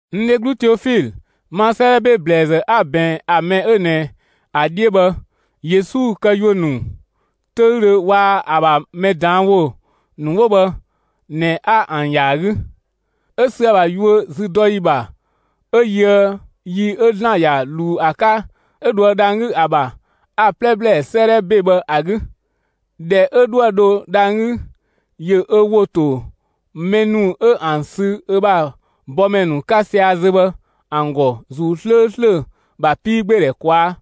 N dheglu Teofilö, ma 'sëëdhɛ ‑be ‑blɛɛzë 'a‑ ꞊bɛɛn ‑a mɛ 'ö ꞊nɛ ‑a 'dhiö bhë Yesu këyuö ‑nu 'töüdhö waa‑ ‑a ‑bha mɛ ꞊daan' ‑wo ‑nu 'wo bhë ꞊nɛ, 'a ‑an ‑ya ‑a 'gü, 'ö sü ‑a ‑bha yuö züdɔyi ‑bha 'ö yöë yi 'ö ‑Zlan ‑ya ꞊luu ‑a 'ka 'ö dhoë dhang‑ 'gü ‑a ‑bha, a‑ 'plɛ ‑blɛɛ 'sëëdhɛ ‑be bhë ‑a 'gü. ꞊Dhɛ 'ö 'dhoë‑ dho dhang‑ 'gü, ‑yö ö ‑wo ‑to mɛ ‑nu 'ö ‑an sü ö bha bɔmɛ ‑nu 'ka sia‑ zö bhë ‑an ‑gɔ ‑Zuu 'slööslö ‑bha 'piigbeedhɛ ꞊kwaa'.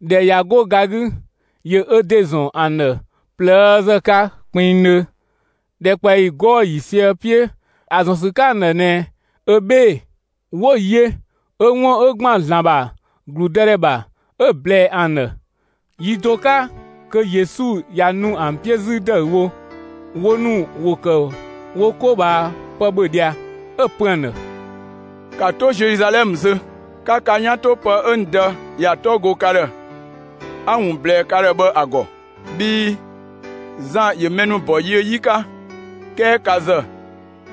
꞊Dhɛ ꞊ya 'go ga 'gü, ‑yö ö ‑de ‑zɔn ‑an ‑dhë ꞊plëëzë 'ka kpinngdhö, ‑dhɛkpaɔyi 'gɔɔ‑ ‑yiisië 'piö ‑a ‑zɔn ‑sü 'ka ‑an ‑dhë ꞊nɛ ö 'bhee‑. 'Wo‑ yö 'ö 'wun 'ö ‑gban ‑Zlan ‑bha ‑gludëdhɛ ‑bha 'ö‑ ꞊blɛɛ ‑an ‑dhë. Yi do 'ka kö Yesu ꞊ya nu ‑an 'piö 'zü ‑dëüwo, wo ‑nu ‑wo ‑kë wo 'ko ꞊bhaa pë ‑bhö ꞊dhia, 'ö‑ pö ‑an ‑dhë: «‑Ka 'to Zeluzalɛmë zö, 'ka ka 'yan 'to pë 'ö n Dë ‑ya 'tɔ go ka ‑dhë, 'a‑ ‑wun ꞊blɛɛ ka ‑dhë bhë ‑a ‑gɔ! Bhii Zan ‑yö mɛ ‑nu ‑bɔ yiö 'yi 'ka, 'kɛɛ ka ‑zë,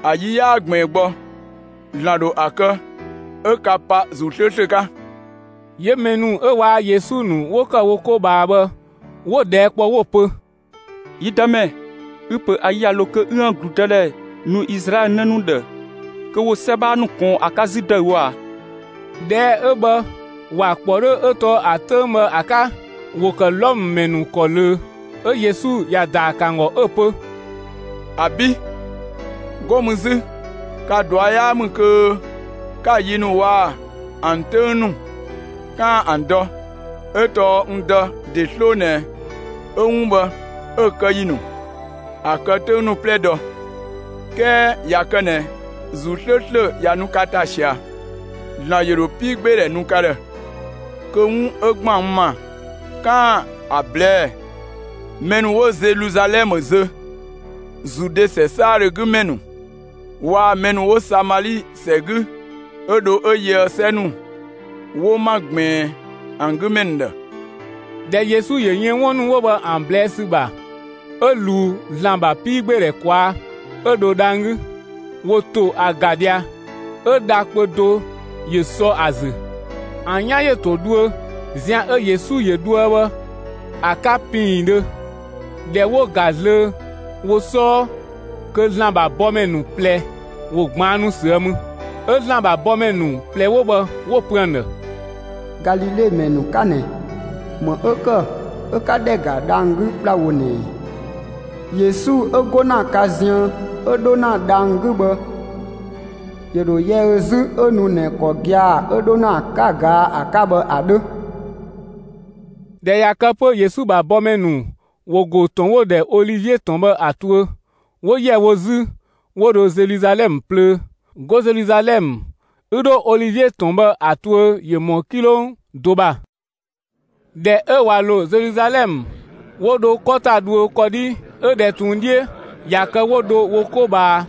‑a yi 'yaa ꞊gbiin gbɔ, ‑Zlan ‑dho ‑a kë 'ö ka pa ‑Zuu 'slööslö 'ka!» 'Yö mɛ ‑nu 'ö waa‑ Yesu ‑nu 'wo ‑kë wo 'ko ꞊bhaa bhë, 'wo‑ ꞊dhɛɛ' kpɔ 'wo‑ pö: «Yi Dëmɛ, ü‑ ‑pö ‑a yi ꞊ya ‑lo kö 'üën‑ ‑gludëdhɛ nu Izlaɛlö 'në ‑nu ‑dhë kö ‑wo 'sɛ 'bhaa ‑nu ꞊kɔɔn ‑a 'ka 'zü ‑dëüwo ꞊a?» (꞊Dhɛɛ' 'ö bhë, ‑wa ‑kpɔ 'dhö 'ö tɔɔ ‑a 'töng bhë ‑a 'ka, ‑wo ‑kë Wlɔmë ‑mɛ ‑nu ‑kɔ ꞊löö.) 'Ö Yesu ‑ya ‑daa ‑kë ‑an ‑gɔ 'ö‑ pö: «‑Abi', 'go mü 'zü ka ꞊dua' 'yaa ‑mü kö 'ka‑ yi ‑nu waa‑ ‑an 'töng ‑nu 'kaan‑ ‑an dɔ, 'ö tɔɔ n Dë ‑de 'sloo ꞊nɛ 'ö 'wun bhë 'ö‑ kë ‑yi ‑nu, ‑a kë 'töng ‑nu 'plɛ dɔ. 'Kɛɛ ꞊ya kë ꞊nɛ ‑Zuu 'slööslö ꞊ya nu ka ‑ta ꞊sia, ‑Zlan ‑yö ‑dho 'piigbeedhɛ nu ka ‑dhë, kö 'wun 'ö ‑gban n ‑ma 'kaan‑ ‑a ꞊blɛɛ'‑ mɛ ‑nu 'wo Zeluzalɛmë zö, Zude ‑sɛ 'saadhö 'gü ‑mɛ ‑nu waa‑ mɛ ‑nu 'wo Samali ‑sɛ 'gü 'ö dho 'ö yöë 'sɛ ‑nu 'wo 'ma ꞊gbiin ‑an 'gü ‑mɛ ‑nu ‑dhë.» ꞊Dhɛ Yesu ‑yö yën 'wun ‑nu 'wo bhë ‑an ꞊blɛɛ' ‑sü ‑bha, 'ö ꞊luu ‑Zlan ‑bha 'piigbeedhɛ ꞊kwaa' 'ö dho dhang‑ 'gü. ‑Wo ‑to ‑a ‑ga ꞊dhia 'ö dha kpö do ‑yö sɔ ‑a ‑zü. ‑An 'yan ‑yö ‑to dhuö, zian 'ö Yesu ‑yö dhoë bhë ‑a 'ka ‑piindhö. ꞊Dhɛ 'wo ‑ga zlöö wo 'sɔɔ, kö ‑Zlan ‑bha bɔmɛ ‑nu ꞊plɛ ‑wo ꞊gbaannu ꞊süë' mü. 'Ö ‑Zlan ‑bha bɔmɛ ‑nu ꞊plɛ 'wo bhë 'wo‑ pö ‑an ‑dhë: «Galile ‑mɛ ‑nu 'ka ꞊nɛ, ‑më 'ö ‑kë 'ö 'ka ‑dhɛ ‑ga ‑na dhang‑ 'gü ‑kplawo ꞊nɛ ꞊ɛ? Yesu 'ö 'go ‑na ka ziën 'ö 'dho ‑na dhang‑ 'gü bhë, ‑yö ‑dho yɛ ö 'zü 'ö nu ꞊nɛ ‑kɔ gia‑ 'ö 'dho ‑na ‑a 'ka 'ö 'ka‑ ꞊gaa' ‑a 'ka bhë ‑a 'dhö.» ꞊Dhɛ ꞊ya kë 'pö Yesu ‑bha bɔmɛ ‑nu ‑wo ‑go ‑tɔn 'wo‑ ‑dhɛ Olivie ‑tɔn bhë ‑a tuö, 'wo ‑yɛ wo 'zü, 'wo dho Zeluzalɛmë plöö. 'Go Zeluzalɛmë 'ü 'dho Olivie ‑tɔn bhë ‑a tuö ‑yö ‑mɔ 'kilong do ‑bha. ꞊Dhɛ 'ö ꞊wa ‑lo Zeluzalɛmë, 'wo dho 'kɔ ‑ta dhuö, 'kɔdhi 'ö ꞊dhɛ ꞊tun 'dhiö, ꞊ya kë 'wo dho wo 'ko ꞊bhaa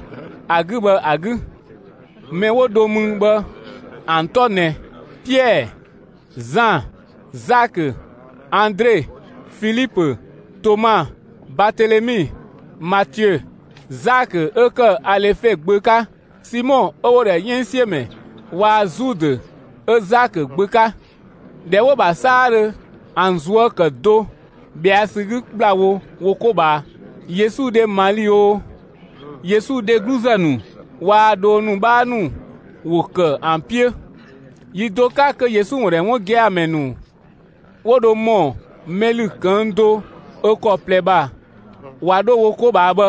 ‑a 'gü bhë ‑a 'gü. Mɛ 'wo dho mü bhë ‑an 'tɔ ꞊nɛ: Piɛɛ, Zan, Zakö, Andre, Filipö, Toma, Batelemi, Matiö, Zakö 'ö ‑kë Alefe gbö 'ka, Simɔ 'ö 'wo‑ ‑dhɛ 'yënngsiömɛ waa‑ Zudë 'ö Zakö gbö 'ka. ꞊Dhɛ 'wo‑ ‑bha 'saadhö, ‑an ꞊zuö' ‑kë do ꞊bhɛa' ‑sü 'gü ‑kplawo wo 'ko ꞊bhaa. Yesu dhe Mali oo, Yesu dhegluzë ‑nu waa‑ dhoo ‑nu 'bhaa ‑nu ‑wo ‑kë ‑an 'piö. Yi do 'ka kö Yesu ‑wun ‑dhɛ 'wun gia‑ ‑mɛ ‑nu 'wo dho ‑mɔ mɛ ‑lü ꞊këng' do ö ‑kɔ ꞊plɛ ‑bha ꞊wa 'dho 'ko ꞊bhaa bhë,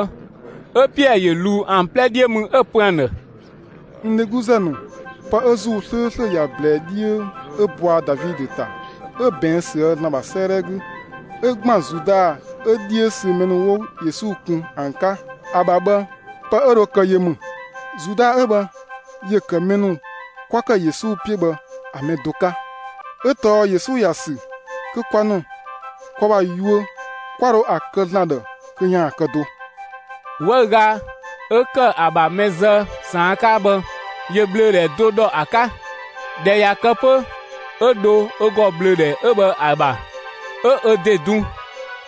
'ö Piɛɛ ‑yö ꞊luu ‑an 'plɛ 'dhiö mü 'ö‑ pö ‑an ‑dhë: «N dhegluzë ‑nu, pë 'ö ‑Zuu 'slööslö ‑ya ꞊blɛɛ 'dhiö 'ö bɔa Davidö ‑ta 'ö ꞊bɛɛn' ꞊süë' ‑Zlan ‑bha 'sëëdhɛ 'gü 'ö ‑gban Zuda 'ö 'dhiö sü mɛ ‑nu 'wo Yesu kun ‑an 'ka ‑a ‑bha bhë pë 'ö dho kë yö ‑mü. Zuda 'ö bhë ‑yö ‑kë mɛ ‑nu 'kwa ‑kë Yesu 'piö bhë ‑a mɛ do 'ka, 'ö tɔɔ Yesu ‑ya ‑sü kö kwa ‑nu kwa ‑bha yuö 'kwa dho ‑a kë ‑Zlan ‑dhë kö ‑yaan kë do. 'Wëüga 'ö ‑kë ‑a ‑bha mɛ zë ꞊saan' 'ka bhë, ‑yö ꞊bhlöödhɛ do ‑dhɔ ‑a 'ka. ꞊Dhɛ ꞊ya kë 'pö, 'ö dho ö ‑gɔ bhlöödhɛ 'ö bhë ‑a ‑bha, ('ö ö ‑de dun).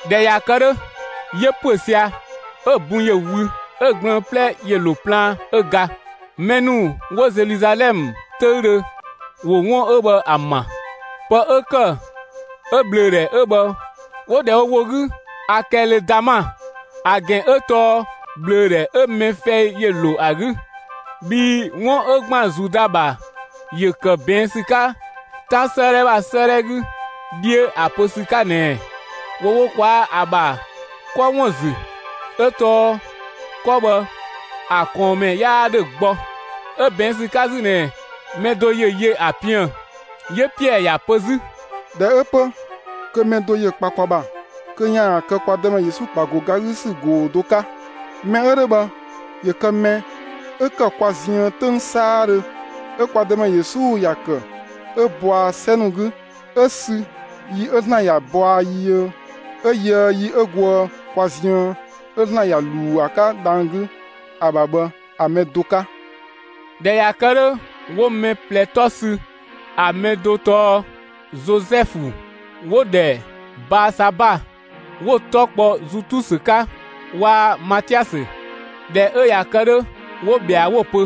꞊Dhɛ ꞊ya kë 'dhö, ‑yö ‑püö sia‑, 'ö‑ bun ‑yö wü, 'ö‑ gblëën‑ 'plɛ ‑yö ‑lo plaan 'ö ga. Mɛ ‑nu 'wo Zeluzalɛmë 'töüdhö, ‑wo 'wun 'ö bhë ‑a ma. Pë 'ö ‑kë 'ö ꞊bhlöödhɛ 'ö bhë 'wo‑ ‑dhɛ wo ‑wo 'gü Akɛlödama (‑a ‑gɛn 'ö tɔɔ ꞊bhlöödhɛ 'ö mɛ fɛi ‑yö ‑lo ‑a 'gü). Bhii 'wun 'ö ‑gban Zuda ‑bha ‑yö ‑kë ꞊bɛɛn' ‑sü 'ka 'Tan 'sëëdhɛ ‑bha 'sëëdhɛ 'gü 'dhiö ‑a pö ‑sü 'ka ꞊nɛɛ: ‑Wo wo ꞊kwaa'‑ ‑a ‑bha 'kɔ ‑wun ‑zü, 'ö tɔɔ 'kɔ bhë ‑a ꞊kɔɔnmɛ 'yaa 'dhö gbɔ. 'Ö ꞊bɛɛn' ‑sü 'ka 'zü ꞊nɛɛ: Mɛ do ‑yö yö ‑a piën‑!» 'Yö Piɛɛ ‑ya pö 'zü: «꞊Dhɛ 'ö 'pö, kö mɛ do ‑yö kpa kwa ‑bha kö ‑yaan kë kwa Dëmɛ Yesu ‑bha ‑go ga 'gü ‑sü ꞊goo‑ do 'ka. Mɛ 'ö 'dhö bhë ‑yö kë mɛ 'ö ‑kë kwa ziën 'töng 'saadhö 'ö kwa Dëmɛ Yesu ‑ya ‑kë 'ö bɔa 'sɛ ‑nu 'gü, 'ö sü yi 'ö Zan ‑ya ‑bɔa yiö 'ö yöë yi 'ö goë kwa ziën 'ö ‑Zlan ‑ya ꞊luu ‑a 'ka dhang‑ 'gü ‑a ‑bha bhë ‑a mɛ do 'ka.» ꞊Dhɛ ꞊ya kë 'dhö, 'wo mɛ ꞊plɛ 'tɔ sü: ‑A mɛ do tɔɔ Zozɛfu 'wo‑ ‑dhɛ Baasaba 'wo‑ 'tɔ kpɔ Zutusö 'ka waa‑ Matiasö. ꞊Dhɛ 'ö ꞊ya kë 'dhö 'wo ꞊bhɛa, 'wo‑ pö: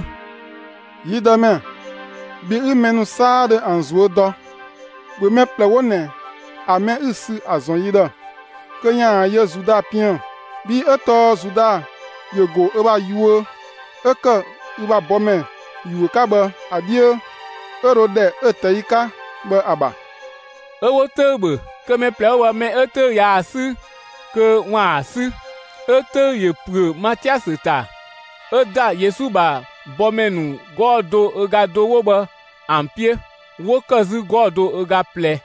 «Yi Dëmɛ, bhi 'ü mɛ ‑nu 'saadhö ‑an ꞊zuö' dɔ, ‑bhö mɛ ꞊plɛ 'wo ꞊nɛ ‑a mɛ 'ü‑ sü ‑a ‑zɔn yi ‑dhë kö ‑yaan yö Zuda piën‑! Bhii 'ö tɔɔ Zuda ‑yö ‑go ö ‑bha yuö 'ö ‑kë ü ‑bha bɔmɛ ‑yuö 'ka bhë ‑a 'dhiö, 'ö dho ‑dhɛ 'ö‑ ꞊tɛi' 'ka bhë ‑a ‑bha.» 'Ö 'wo 'töü‑ ‑bhö, kö mɛ ꞊plɛ 'wo bhë, mɛ 'ö 'töü‑ ꞊yaa‑ 'sü kö ‑waan 'sü. 'ö 'töü‑ ‑yö ‑püö Matiasö ‑ta, 'ö ‑da Yesu ‑bha bɔmɛ ‑nu 'gɔɔ‑ do ö ga do 'wo bhë ‑an 'piö ('wo ‑kë 'zü 'gɔɔ‑ do ö ga ꞊plɛ).